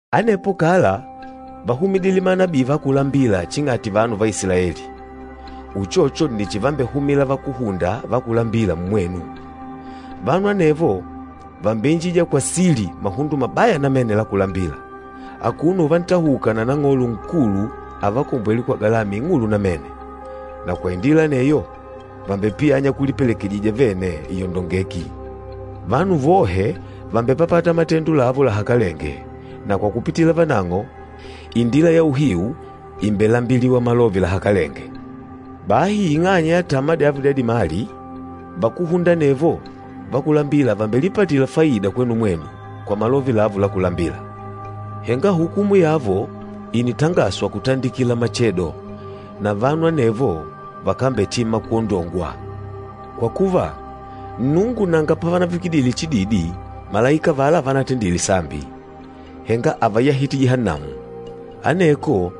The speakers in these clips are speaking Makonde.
Anepo kala váhumidile manabii va kulambila ching'ati vanu va Isilaeli, uchocho nni chivambehumila vakúhunda va kulambila mmwenu. Vanu anevo vàmbeinjija kwa sili mahundo mabaya namene la kulambila, akuno uvantahuka na Nang'olo Nkulu avakombwêle kwa galama ing'ulu namene, na kwa indila aneyo vàmbepiyanya kulipelekejija vene iyondongeki. Vanu vohe vàmbepapata matendo lavo lahakalenge na kwa kupitila vanang'o, Indila ya Uhiu ìmbelambiliwa malove lahakalenge. Bahi ing'anya ya tama dyavo dya dimali, vakúhunda anevo va kulambila vàmbelipatila faida kwenu mwenu kwa malove lavo la kulambila. Henga hukumu yavo ìnitangaswa kutandikila machedo, na vanu anevo vakambetima kwondongwa. Kwa kuva, Nnungu nanga panavavikidile chididi malaika avala vanatendile sambi, henga ávayahite Jihannamu. Aneko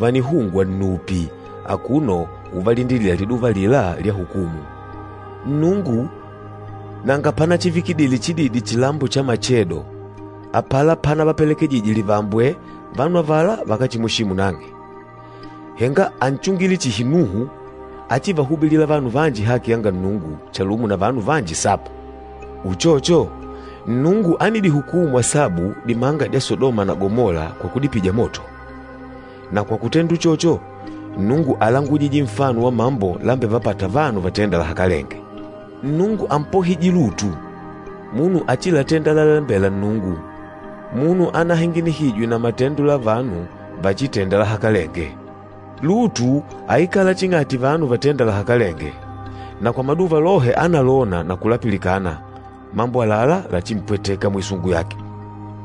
vànihungwa nnupi akuno uvalindilila liduva alila lya hukumu. Nnungu nanga panachivikidile chididi chilambo cha machedo, apala panavapelekejijije livambwe vanu avala vakáchimweshimu nang'e, henga ánchungile chihi Nuhu áchivahubilila vanu vanji haki yanga Nnungu, chalumo na vanu vanji saba. Uchocho, Nnungu ánidihukumu asabu dimanga dya Sadoma na Gamola kwa kudipija moto. Na kwa kutenda uchocho, Nnungu álangujije nfano wa mambo lambevapâta vanu vatênda lahakalenge. Nnungu ámpohije Lutu, munu áchilatenda lalalembela Nnungu, munu anahinginihijwe na matendo la vanu váchitèndà lahakalenge. Lutu áikala ching'ati vanu vatênda lahakalenge, na kwa maduva lohe ánalona na kulapilikana mambo àlalá lachimpwetêka mwisungu yake.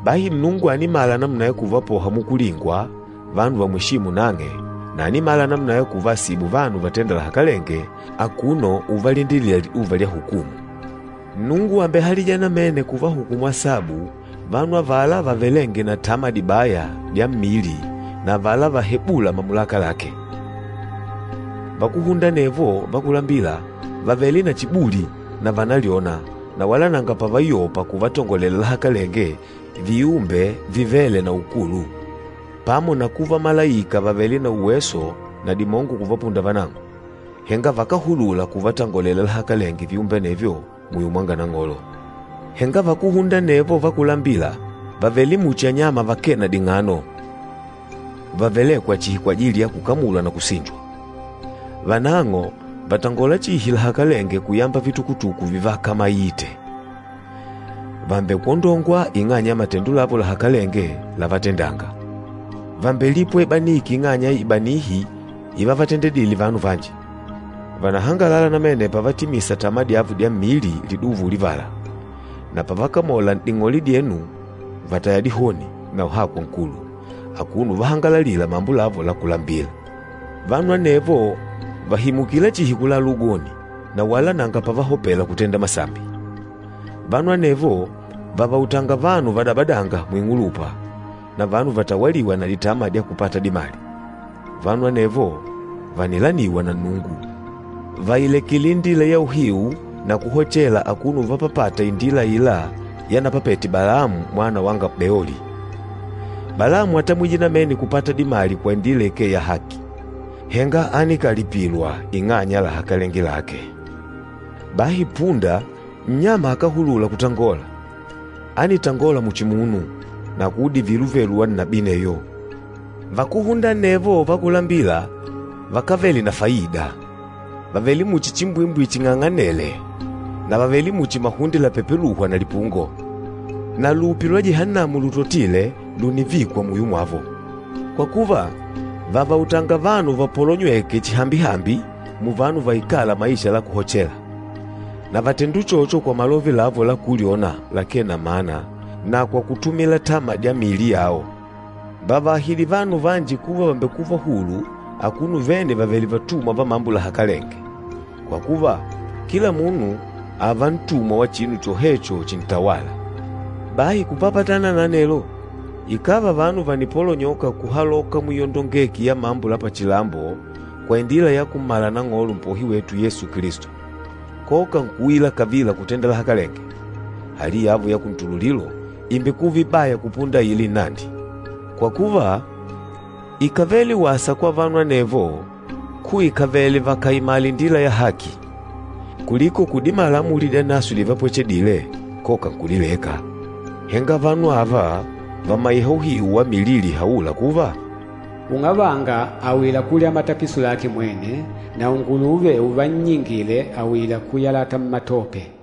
Bahi Nnungu ànimala namuna ya kuvapoha mukulingwa vanu vamweshîmu nang'e na ànimala namuna ya kuvaasibu vanu vatênda lahakalenge akuno uvalindilila liduva lya hukumu. Nnungu àmbehalija namene kuvahukumu asabu vanu avala vavelênge na tama dibaya dya mmili na avala valahebûla mamulaka lake. Vakúhunda anevo va kulambila vàvele na chibuli na vànalyona na wala nanga pavayopa kuvatongolela lahakalenge viumbe vivêle na ukulu. Pamo na kuva malaika vàvele na uweso na dimongo kuvapunda vanang'o, henga vakáhulula kuvatangolela lahakalenge viumbe anevyo muyo mwanga Nang'olo. Henga vakúhunda anevo va kulambila vàvele muchi anyama vakee na ding'ano vavelêkwa chihi kwajili ya kukamulwa na kusinjwa. Vanang'o vàtangola chihi lahakalenge kuyamba vitukutuku vivakamaite. Vàmbekwondongwa ing'anya ya matendo lavo lahakalenge lávatendàngà. Vàmbelipwa ibaniki ing'anya ya ibanihi ivavatendedile vanu vanji. Vànahangalala namene pavatimisa tama dyavo dya mmili liduva ulivala, na pavakamola n'ding'ole dyenu vàtaya dihoni na uhakwa nkulu, akuno uvahangalalila mambo lavo la kulambila. Vanu anevo vàhimukila chihi kulala ugoni na wala nanga pavahopela kutenda masambi. Vanu anevo vàvautanga vanu vadabadânga muing'ulupa, na vanu vatawalîwa na ditama dya kupata dimali. Vanu anevo vànilaniwa na Nnungu. Vàilekile indila ya uhiu na kuhochela akuno uvapapata indila aila yanapapete Balamu mwana wanga Beoli. Balamu átamwije namene kupata dimali kwa indila ikee ya haki, henga ánikalipilwa ing'anya ya lahakalenge lake. Bahi punda, nnyama akáhulula kutangola, ánitangola muchi munu na kuudivila uvelu wa nnabii aneyo. Vakúhunda anevo va kulambila vakávele na faida. Vàvele muchi chimbwimbwi ching'ang'anêle na vàvele muchi mahunde lapepelûhwa na lipungo. Na lupi lwa Jihannamu lutotile lùnivikwa muyo mwavo. Kwa kuva, vàvautanga vanu vapolonywêke chihambi-hambi muvanu vaikâla maisha la kuhochela. Na vàtenda uchocho kwa malove lavo la kulyona lakee na mana na kwa kutumila tama dya miili yao. Vàvaahidi vanu vanji kuva vàmbekuva hulu akuno vene vavèlè vatumwa va mambo lahakalenge. Kwa kuva, kila munu ààva ntumwa wa chinu chohecho chintawâla. Bahi kupapatana na anelo, ikàva vanu vànipolonyoka kuhaloka muiyondongeki ya mambo la pachilambo kwa indila ya kummala Nang'olo, Mpohi wetu Yesu Kilisto, koka nkuuila kavila kutenda lahakalenge, hali yavo ya kuntululilo ìmbekuva ibaya kupunda aila inandi. Kwa kuva, íkavele wasa kwa vanu anevo kuikavele vakaimala indila ya haki, kuliko kudimala amuli dyanaswe divadipwechedile koka nkudileka. Henga vanu ava vàmaiha uhiu wa milili ihaûla kuva, “Ung'avanga àuyila kulya matapiso lake mwene,” na “Unguluve uvannyingile àuyila kuyalata mmatope.”